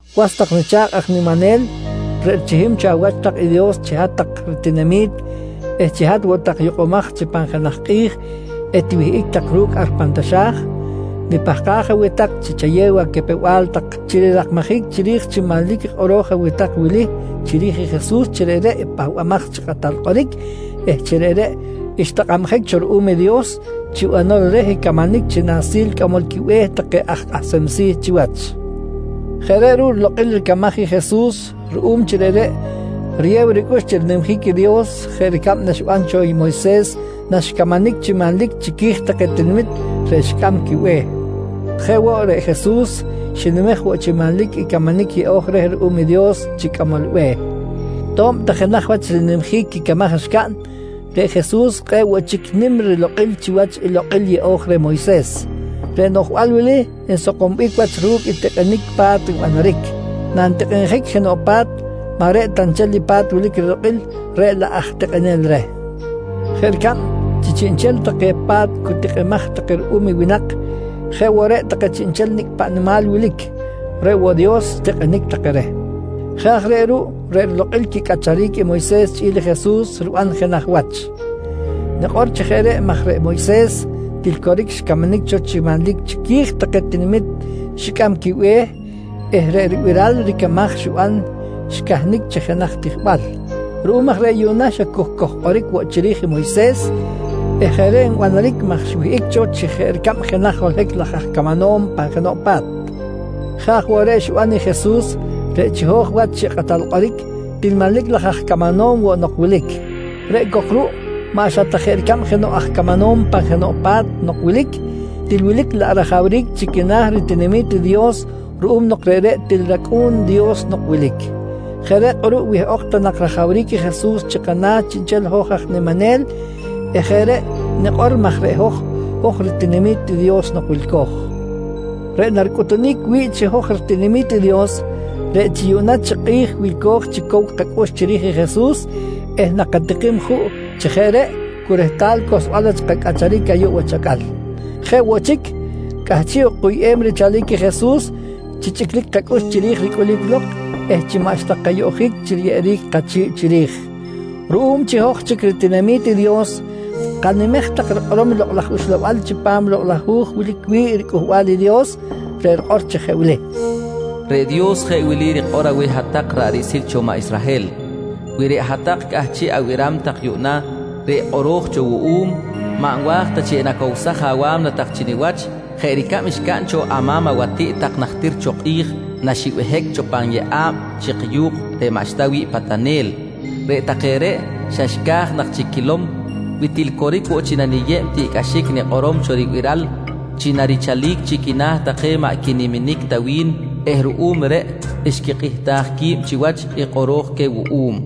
Was tak nicha̱kꞌ aj niminel, reꞌ richihim cho awach tak i Dios chi hat-tak ritinami̱t eh chi hat woꞌ tak yukꞌumaj chi pan jenaj kꞌi̱j etiwihꞌic tak ru̱cꞌ ar pan taxa̱j, nipahkaj aweh tak chi chayew acapew-bal tak chi rirakmajic chiri̱j chi manlic i kꞌoro̱j aweh tak wili chiri̱j i Jesus chi reꞌreꞌ i Pahbamaj chi Kꞌatal Kꞌoric eh chi reꞌreꞌ xtakꞌabjic cho ruꞌum i Dios chi banol reh camanic chi Nahsil Cꞌamol quiBe̱h take aj Kꞌahsem Si̱ chiwach. Jeꞌ reꞌ ruꞌ rilokꞌil ricamaj i Jesus ruꞌum chi reꞌreꞌ riyew ricꞌux chi rinimjic i Dios jeꞌ ricab naxiban cho Moyses naxcamanic chi manlic chiqui̱j take tinamit reꞌ xicꞌam quibe̱h. Jeꞌ woꞌ, reꞌ Jesus xinimej woꞌ chi manlic i camanic yeꞌo̱j reh ruꞌum i Dios chi cꞌamol be̱h. To̱b ta jenaj wach rinimjic quicamaj xcaꞌn, reꞌ Jesus kꞌe̱ꞌ woꞌ chic nim rilokꞌil chiwach i lokꞌil yeꞌo̱j reh Moyses. Reꞌ noꞌjbal wili nsakombic wach ru̱cꞌ i tikꞌinic pa̱t nbanaric. Nantikꞌinjic jenoꞌ pa̱t, maꞌ reꞌ ta nchel i pa̱t wilic rilokꞌil reꞌ laꞌ aj tikꞌinel reh. Jeꞌ ricab chi chiꞌnchel take pa̱t cu tikꞌimaj take ruꞌum i winak, jeꞌ woꞌ reꞌ take chiꞌnchel nicꞌ paꞌ nimal wilic, reꞌ woꞌ Dios xtikꞌinic take reh. Jeꞌ aj reꞌ ruꞌ reꞌ rilokꞌil quicꞌacharic i Moyses chꞌi̱l i Jesus riban jenaj wach. Nikꞌor chi jeꞌ reꞌ maj reꞌ Moyses til coric xcamanic cho chi manlic chiqui̱j take tinamit xicꞌam quibe̱h eh reꞌ ribiral ricamaj xiban xcahnic chi jenaj tijbal. Ruꞌum aj reꞌ yuꞌna xa cu kojkꞌoric woꞌ chiri̱j i Moyses eh jeꞌ reꞌ nbanaric maj xwihꞌic cho chi jeꞌ ricab jenaj holohic laj aj camanom pan jenoꞌ pa̱t. Jeꞌ aj woꞌ reꞌ xiban i Jesus reꞌ chiho̱j wach chi Kꞌatal Kꞌoric, til manlic laj aj camanom woꞌ nok wilic. Reꞌ cok ruꞌ maꞌ xa jeꞌ ta ricab jenoꞌ aj camanom pan jenoꞌ pa̱t nok wilic, til wilic laꞌ rajawric chi quina̱ ritinami̱t i Dios ruꞌum nok reꞌreꞌ til rAcꞌu̱n i Dios nok wilic. Jeꞌ reꞌ kꞌuruꞌ wihꞌok ta nak rajawric i Jesus chi kana̱ chiꞌnchel i hoj aj niminel eh jeꞌ reꞌ nikꞌor maj reꞌ hoj, hoj ritinami̱t i Dios nok wilco̱j. Reꞌ naricꞌutunic wi̱ꞌ chi hoj ritinami̱t i Dios, reꞌ chi cu yuꞌna chi kꞌi̱j wilco̱j chi cow kacꞌux chiri̱j i Jesus eh nakatikim juꞌ chi jeꞌ reꞌ cu rehtal cohlsbal wach kacꞌacharic ayuꞌ wach acꞌal. Jeꞌ woꞌ chic, cꞌahchiꞌ ok kuyꞌem richalic i Jesus chi chꞌiclic kacꞌux chiri̱j ricꞌulic lok eh chi maꞌxta kayoꞌjic chi riyeꞌeric kachi̱ꞌ chiri̱j. Ruꞌum chi hoj chic ritinami̱t i Dios, kanimej tak rikꞌorom i Lokꞌ laj Uxlabal chipam Lokꞌ laj Hu̱j wilic wi̱ꞌ riCꞌuhbal i Dios, reꞌ rikꞌor chi jeꞌ wili: “Reꞌ Dios jeꞌ wili rikꞌor aweh hat-tak ra̱ꞌ riꞌsil cho maꞌ Israhel: ‘Wi reꞌ hat-tak cꞌahchiꞌ abiram tak yuꞌna reꞌ kꞌoro̱j cho wuꞌum, maꞌ nwa̱j ta chi enacowsaj awa̱mna tak chi niwach jeꞌ ricab xcaꞌn cho ama̱m awatiꞌt tak najtir cho kꞌi̱j naxibehic cho pan yeꞌa̱b chik yu̱kꞌ reꞌ maꞌxta wi̱ꞌ patanel. Reꞌ take reꞌ xa xca̱j nak chic quilom wi til coric woꞌ chi naniyeb i tiꞌcꞌaxic nikꞌorom cho ribiral chi narichalic chi quina̱ take maꞌ quiniminic ta wi̱n eh ruꞌum reꞌ xquikꞌihtaj qui̱b chiwach i kꞌoro̱j queh wuꞌum.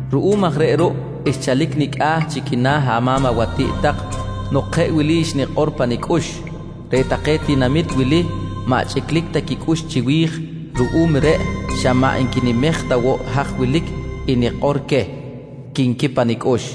Ruꞌum aj reꞌ ruꞌ xchalic nicꞌa̱ chi quina̱ ama̱m awatiꞌt tak nok jeꞌ wili xnikꞌor pa nicꞌux: Reꞌ take tinamit wili maꞌ chꞌiclic ta quicꞌux chiwi̱j, ruꞌum reꞌ xa maꞌ nquinimej ta woꞌ haj wilic i nikꞌor queh, quinqui pa nicꞌux.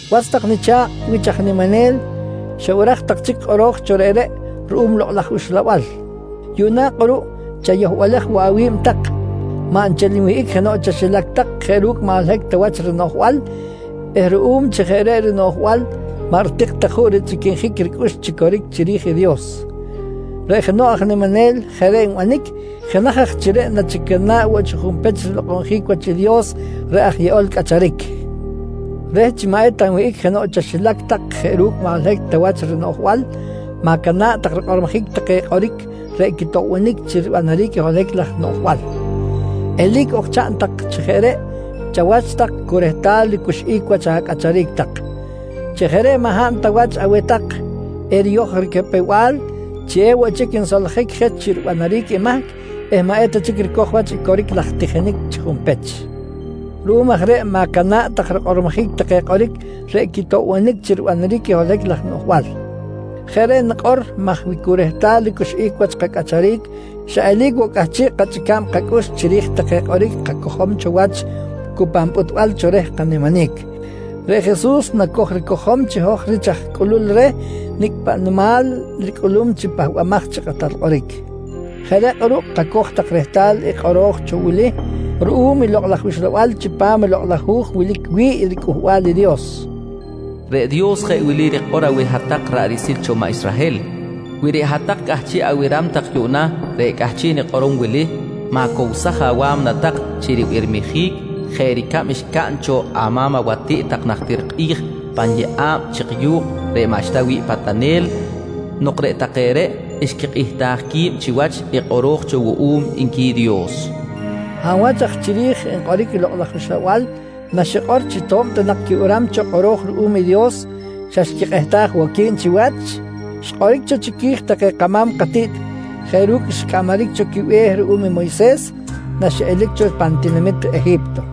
Was tak nicha̱kꞌ wich aj niminel, xabiraj tak chic i kꞌoro̱j cho reꞌreꞌ ruꞌum Lokꞌ laj Uxlabal. Yuꞌna kꞌuruꞌ chayohbalej woꞌ awi̱b tak, maꞌ nchel nwihꞌic jenoꞌ chaxilac tak jeꞌ ru̱cꞌ maꞌ holohic ta wach rinoꞌjbal eh ruꞌum chi jeꞌ reꞌ rinoꞌjbal maꞌ ritik ta juꞌ richꞌiquinjic ricꞌux chi coric chiri̱j i Dios. Reꞌ jenoꞌ aj niminel jeꞌ reꞌ nbanic, jenaj aj chi reꞌ nachicana̱ꞌ woꞌ chi junpech rilokꞌonjic wach i Dios reꞌ aj yeꞌol cꞌacharic. Reh chi maꞌ eta nwihꞌic jenoꞌ chaxilac tak jeꞌ ru̱cꞌ maꞌ holohic ta wach rinoꞌjbal, ma̱cana̱ꞌ tak rikꞌormojic take kꞌoric reꞌ quitoꞌbonic chi ribanaric i holohic laj noꞌjbal. Eli̱c ok chaꞌn tak chi jeꞌ reꞌ chawach tak cu rehtal ricuxꞌic wach acꞌacharic tak. Chi jeꞌ reꞌ maꞌ hab ta wach aweh tak eriyoj ricapew-bal chi ewoꞌ chic nsoljic je chi ribanaric i mahc eh maꞌ eta chic ricoj wach i coric laj tijinic chi junpech. Ruꞌum aj reꞌ ma̱cana̱ꞌ tak rikꞌormojic take kꞌoric reꞌ quitoꞌbonic chi ribanaric i holohic laj noꞌjbal. Jeꞌ reꞌ nikꞌor maj wi cu rehtal ricuxꞌic wach kacꞌacharic xa eli̱c woꞌ cꞌahchiꞌ kachꞌica̱b kacꞌux chiri̱j take kꞌoric kacojom cho wach cu pan pꞌutbal cho reh kaniminic, reꞌ Jesus naco̱j ricojom chi hoj rich aj cꞌulul reh nicꞌ paꞌ nimal ricꞌulum chi Pahbamaj chi Kꞌatal Kꞌoric. Jeꞌ reꞌ kꞌuruꞌ kacoj tak rehtal i kꞌoro̱j cho wili ruꞌum i Lokꞌ laj Uxlabal chipam i Lokꞌ laj Hu̱j wilic wi̱ꞌ riCꞌuhbal i Dios: “Reꞌ Dios jeꞌ wili rikꞌor aweh hat-tak ra̱ꞌ riꞌsil cho maꞌ Israhel: ‘Wi reꞌ hat-tak cꞌahchiꞌ abiram tak yuꞌna reꞌ cꞌahchiꞌ nikꞌorom wili, ma̱cowsaj awa̱mna tak chi ribirmijic jeꞌ ricab xcaꞌn cho ama̱m awatiꞌt tak najtir kꞌi̱j pan yeꞌa̱b chik yu̱kꞌ reꞌ maꞌxta wi̱ꞌ patanel nok reꞌ take reꞌ xquikꞌihtaj qui̱b chiwach i kꞌoro̱j cho wuꞌum, nqui Dios, nqui kꞌoro̱j cho ruꞌum i Lokꞌ laj Uxlabal. Hab wach aj chiri̱j nkꞌoric i Lokꞌ laj Uxlabal naxikꞌor chi to̱b ta nak quibiram cho kꞌoro̱j ruꞌum i Dios xa xquikꞌihtaj woꞌ qui̱b chiwach? Xkꞌoric cho chiqui̱j take kama̱m katiꞌt jeꞌ ru̱cꞌ xcꞌamaric cho quibe̱h ruꞌum i Moyses naxiꞌelic cho pan tinamit Eji̱pto.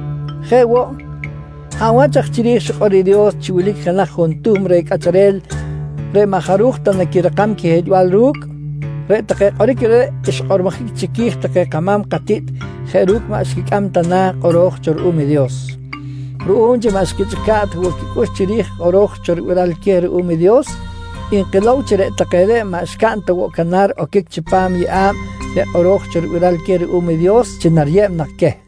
Jeꞌ woꞌ, hab wach aj chiri̱j xikꞌor i Dios chi wilic jenaj juntuhm reh cꞌacharel reꞌ maꞌ jaruj ta naquirakam quihiꞌlbal ru̱cꞌ? Reꞌ take kꞌoric reꞌreꞌ xkꞌormojic chiqui̱j take kama̱m katiꞌt jeꞌ ru̱cꞌ maꞌ xquicꞌam ta na̱ i kꞌoro̱j cho ruꞌum i Dios. Ruꞌum chi maꞌ xquichꞌica̱ꞌ ta woꞌ quicꞌux chiri̱j i kꞌoro̱j cho ribiral queh ruꞌum i Dios, nkilow chi reꞌ take reꞌ maꞌ xcaꞌn ta woꞌ canar oquic chipam yeꞌa̱b reꞌ kꞌoro̱j cho ribiral queh ruꞌum i Dios chi nariyeb nak queh.